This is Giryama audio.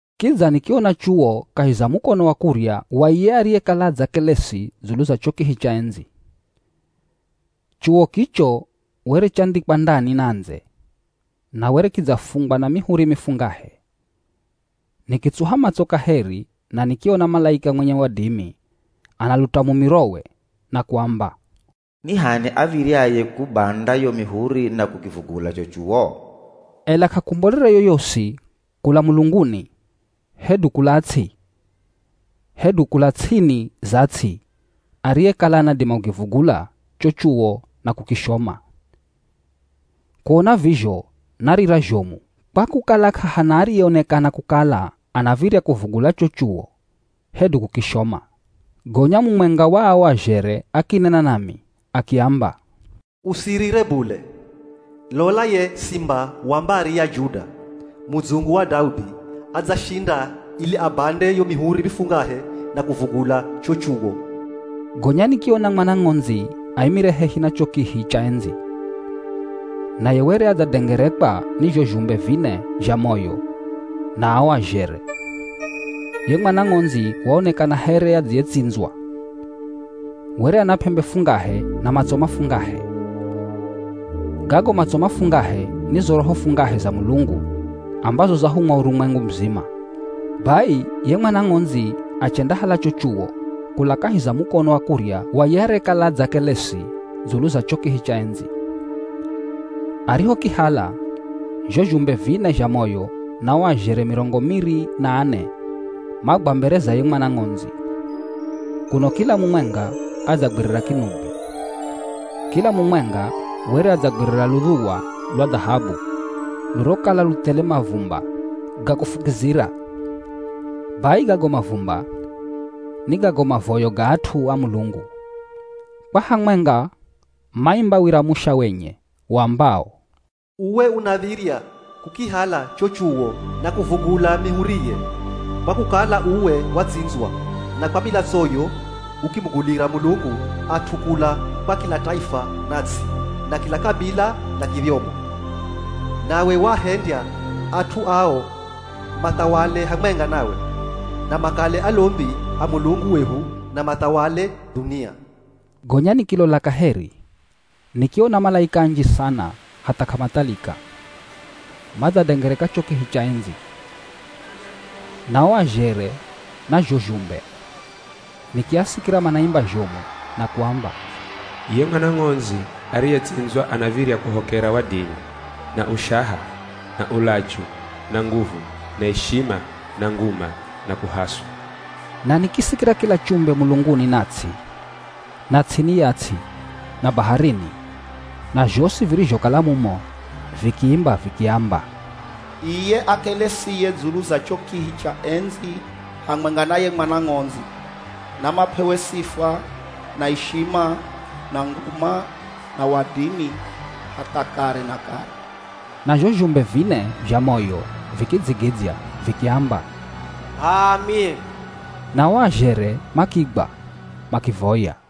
Kidza nikiona chuwo kahi za mukono wa kurya wa iye ariyekala adzakelesi dzulu za cho kihi cha endzi. Chuwo kicho were chandhikwa ndani na ndze na were kidzafungwa na mihuri mifungahe. Nikitsuha matso kaheri na nikiona malaika mwenye wadimi analuta mumirowe na kuamba, “Ni h'ani av̱iryaye kubanda yo mihuri na kukivugula cho chuwo?” Ela k'akumbolere yoyosi kula mulunguni hedu kula ts'i hedu kula ts'ini za ts'i ariyekala anadima kukivugula cho chuwo na kukishoma. Kuona vizho narira zhomu kwa kukala k'ahana ariyeonekana kukala anav̱irya kuvugula cho chuwo hedu kukishoma. Gonya mumwenga wa o azhere akinena nami akiamba, “Usirire bule, lola ye Simba wa mbari ya Juda, Mudzungu wa Daudi adzashinda ili abande yo mihuri mifungahe na kuvugula cho chuwo.” Gonya nikiona Mwana Ng'ondzi aimire hehi na cho kihi cha endzi. Naye were adzadengerekwa ni zho zhumbe vine zha moyo na o azhere. Ye Mwana Ng'ondzi waonekana here adziyetsindzwa. Were ana p'embe fungahe na matso mafungahe. Gago matso mafungahe ni zo roho fungahe za Mulungu ambazo zahumwa urumwengu muzima. Bai ye Mwana Ng'ondzi achendahala cho chuwo kula kahi za mukono wa kurya wa ye arekala adzakelesi dzulu za cho kihi cha endzi. Arihokihala, zho zhumbe vine zha moyo na o azhere mirongo miri na ane magwa mbere za ye Mwana Ng'ondzi, kuno kila mumwenga adzagwirira kinubi. Kila mumwenga were adzagwirira ludhuwa lwa dhahabu lurokala lu thele mavumba ga kufukizira. Bai gago mavumba, ni gago mavoyo ga at'u a Mulungu. Kwa hamwenga maimba wira musha wenye uambao, “Uwe unav̱irya kukihala cho chuwo na kuvugula mihuriye, kwa kukala uwe watsindzwa, na kwa milatsoyo ukimugulira Mulungu at'u kula kwa kila taifa na ts'i, na kila kabila na kidhyomo. Nawe waahendya at'u ao mathawale hamwenga nawe, na makale alombi a Mulungu wehu na mathawale dhunia.” Gonya nikilola kaheri. Nikiona malaika anji sana hatha k'amathalika, madzadengereka cho kihi cha endzi, na o azhere na zho zhumbe. Nikiasikira manaimba zhomu na kuamba, “Ye Mwana Ng'ondzi ariyetsindzwa anav̱irya kuhokera wadimi, na ushaha, na ulachu, na nguvu, na ishima, na nguma, na kuhaswa.” Na nikisikira kila chumbe mulunguni na ts'i, na ts'ini ya ts'i, na baharini, na zhosi virizhokala mumo vikiimba vikiamba, “Iye akelesiye dzulu za cho kihi cha endzi hamwenga na ye Mwana Ng'ondzi, namap'ewe sifa, na ishima, na nguma na wadimi hatha kare na kare.” Na zho zhumbe vine zha moyo vikidzigidzya vikiamba, “H'aami.” Na o azhere makigwa makivoya.